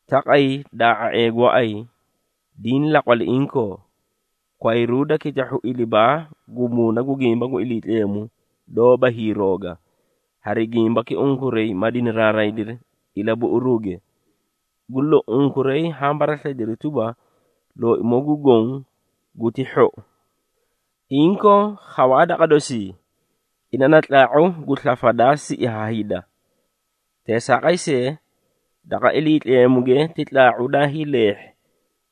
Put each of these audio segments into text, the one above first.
Taqay daa⁄a⁄ee gooay, diĩ laqwali inkoo, kwayruuda kitahhu ilibaa gu muuna gu gimba gu Iliitleemu doóba hiirooga, hari gimbaki unkuray ma dinaraaraydiri ilabuꞌuruuge. Gu lou, unkuray haã baraslayidiri tuba, Looimoo gu Goõ guti hhou. Inkoo, khawaa daqa dosii, ina na Tlaa⁄u gu slafa daa siꞌi ha hida. Teesaaqay see, daqa Iliitleemuge ti tlaa⁄u daay leehhi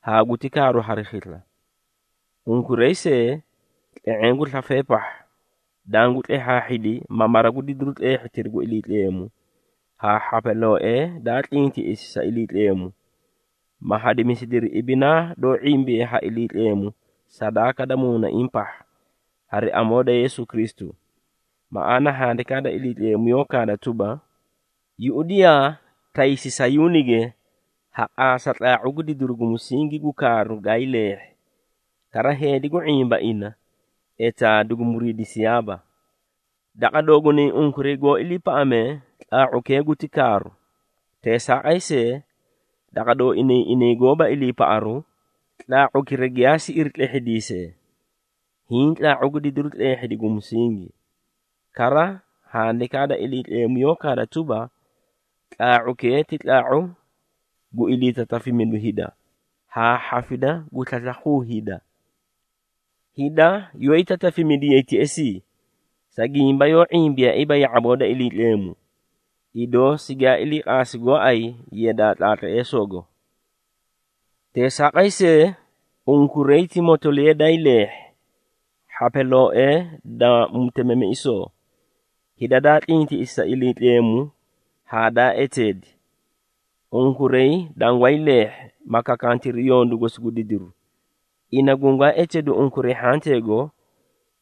haa guti kaaru hari khisla. Unkuray see, tle⁄eẽ gu slafee pahha, dangu tlehhaahhidi, ma mara gu didiru tleehhitiri gu Iliitleemu, haa hhapalooee daa tlintiꞌisi sa Iliitleemu, ma hadimisidiri ibinaa doó ⁄imbiye ha Iliitleemu sadaaka da muunaiĩ pahha, hari amoo da Yeesu Kristu. Maꞌaana, Handikaa da Iliitleemu yoó kaada tuba, “Yuꞌudiyaa, taysi Sayuunige, ha qaasa tlaa⁄u gu didiru gu musingi gu kaaru gaay leehhi, kara heedi gu ⁄imba ina, etaa dugu muriidisiyaaba.” Daqa doogunay unkuray goó iliipaꞌamee, tlaa⁄ukee guti kaaru. Teesaaqay see, daqa dooinay inay goóba iliipaꞌaruu, “Tlaa⁄ukira giyaa siꞌiri tlehhidiisee hiĩ tlaa⁄u gu didiru tleehhidi gu musingi.” Kara, Handikaa da Iliitleemu yoó kaada tuba, “Tlaa⁄ukee ti tlaa⁄u gu iliitatafimidu hida, haa hhafida gu slaslakhuu hida.” Hida yoóyi tatafimidiyay teꞌesii, sa gimba yoó ⁄imbiyaaiiba ya⁄aboo da Iliitleemu, idoo sigaa ilii qaasi gooay yadaa tlaatleesoogo. Teesaaqay see, unkuray ti motoliya daay leehhi, hhapalooee da mutemiꞌisoo, hida daa tlintiꞌisi sa Iliitleemu haa daa eteedi. Unkuray dangwaay leehhi, ma kakantiri yondu gosi gu didiru, ina gungwaa eteedu unkuray hhanteego,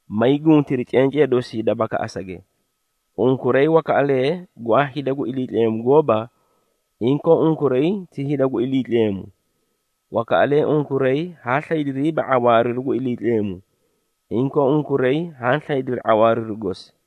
maay guntiri cencee dosii da bakaꞌasage. Unkuray wakaꞌalee gwaa hida gu Iliitleemu gooba, inkoo unkuray ti hida gu Iliitleemu. Wakaꞌalee unkuray haa slaydiriiba ⁄awaariru gu Iliitleemu, inkoo unkuray haã slaydiri ⁄awaariru gosi.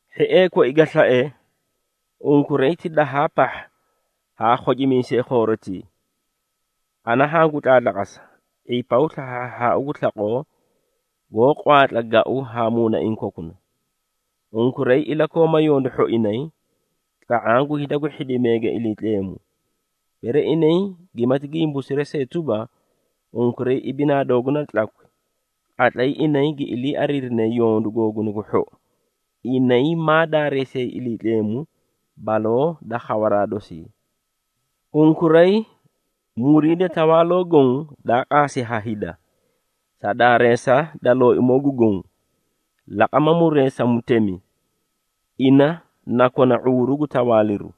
Hhiee koi ga slae, unkuray ti dahaa pahha haa khocimiisee khoorotii! Ana hangu tlaatlaqasa, ⁄ipaw slahhaahhaau gu slaqoo, goó qwaatla gau haa muunaiĩ kokuna. Unkuray ilakooma yondu hhoinay, tla⁄aã gu hida gu hhidimeege Iliitleemu. Bere inay gimati gimbuumisiri see tuba, unkuray ibinaa dooguna da tlakwi, qatlay inay gi ilii ariirinee yondu googuna gu hhou, inay maa daareesiyay Iliitleemu, baloo da khawaraa dosii. Unkuray, muriida tawaaloo goõ, daa qaasi ha hida, sa daareesa da Looimoo gu Goõ. Laqama muree sa mutemi, ina na kona ⁄uuru gu tawaaliru,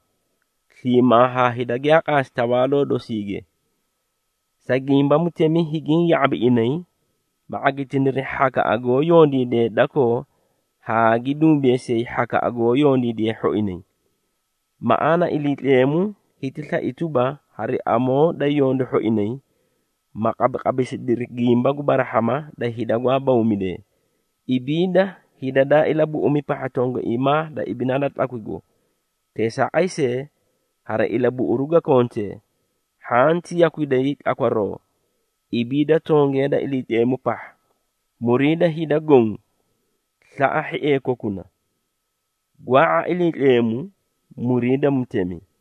sliimaa haa hida giyaa qaasi tawaaloo dosiige. Sa gimba mutemi higiĩ ya⁄abi inay, ma ⁄agitiniri hhakaꞌa goó yondiidee dakoo haa gi dumbeesiyay hhakaꞌa goó yondiidee hhoinay. Maꞌaana, Iliitleemu hiti slai tuba, hari amoo da yondu hhoinay, ma qabiqabisidiri gimba gu barahhama da hida gwaa bawmidee. Ibiida hida daa ilabuꞌumi pahha tongaiimaa da ibinaa da tlakwigo, teesaaqay see, hari ilabuꞌuru ga kontee, hhanti yakwiday tlakwaroo, ibiida tongee da Iliitleemu pahha. Muriida hida goõ. Slaꞌa hhiee kokuna. Gwaa⁄a Iliitleemu. Muriida mutemi.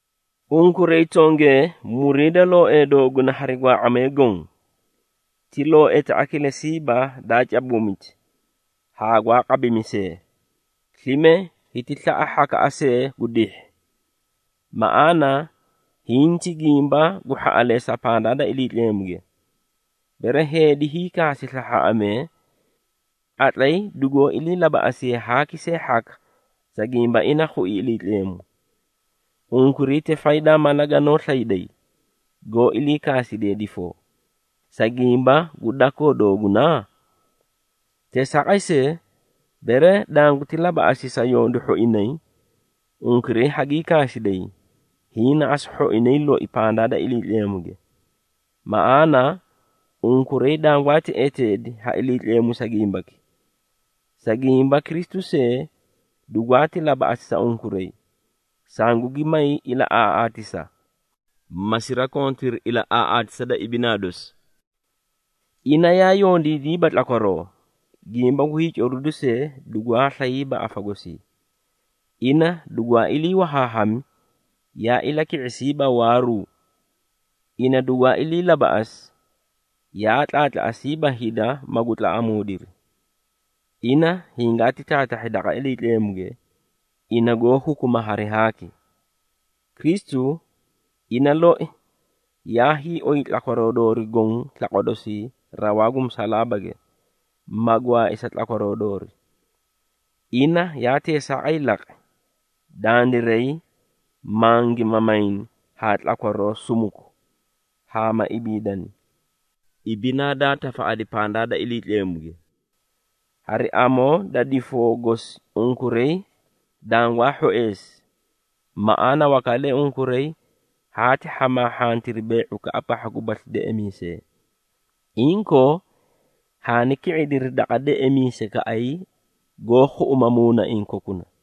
Unkuray tongee muriida looee dooguna hari gwaa⁄amee goõ. Ti looeta kilesiiba daa cabuumiti haa gwaa qabimisee, slime hiti slaꞌa hhakaꞌa see gu dihhi. Maꞌaana, hiĩ ti gimba gu hhaꞌaleesa pandaa da Iliitleemuge, bere heedi hiikaasi slahhaaꞌamee, qatlay dugoó ilii labaꞌasiye haaki see hhaka, sa gimba ina khui Iliitleemu. Unkuray ti faydaa mala ganoó slayday, goó ilii kaasidee difoo, sa gimba gu dakoo dooguna? Teesaaqay see, bere danguti labaꞌasi sa yondu hhoinay, unkuray hagii kaasiday, hiĩ na asu hhoinay loi pandaa da Iliitleemuge. Maꞌaana, unkuray dangwaati eteedi ha Iliitleemu sa gimbaki. Sa gimba Kristu see, dugwaati labaꞌasi sa unkuray, sangugi may ilaꞌaaꞌaatisa, ma sirakontiri ilaꞌaaꞌaatisa da ibinaa dosi. Ina yaa yondiidiiba tlakwaroo, gimba gu hiicoriduu see, dugwaa slayiiba afa gosii. Ina dugwaa ilii wahaahami, yaa ilaki⁄isiiba waaruu. Ina dugwaa ilii labaꞌasi, yaa tlaatlaꞌasiiba hida magu tlaꞌamuudiri. Ina hingaati taatahhi daqa Iliitleemuge, ina goó hukuma hari haaki. Kristu, ina loi, yaa hiioy tlakwaroo doori goõ slaqwa dosii rawaa gu musalaabage, ma gwaai sa tlakwaroo doori. Ina yaa teesaaqay laqi, dandiray mangi mamayni haa tlakwaroo sumuku haa ma ibiidani, ibinaa daa tafaꞌadi pandaa da Iliitleemuge. Hari amoo da difoo gosi unkuray dangwaa hhoeesi. Maꞌaana, wakaꞌalee unkuray haati hhamaahhantiri bee⁄ukaꞌa pahha gubasli deꞌemiisee. Inkoo, haani ki⁄idiri daqa deꞌemiisaykaꞌay goó khuꞌuma muunaiĩ kokuna.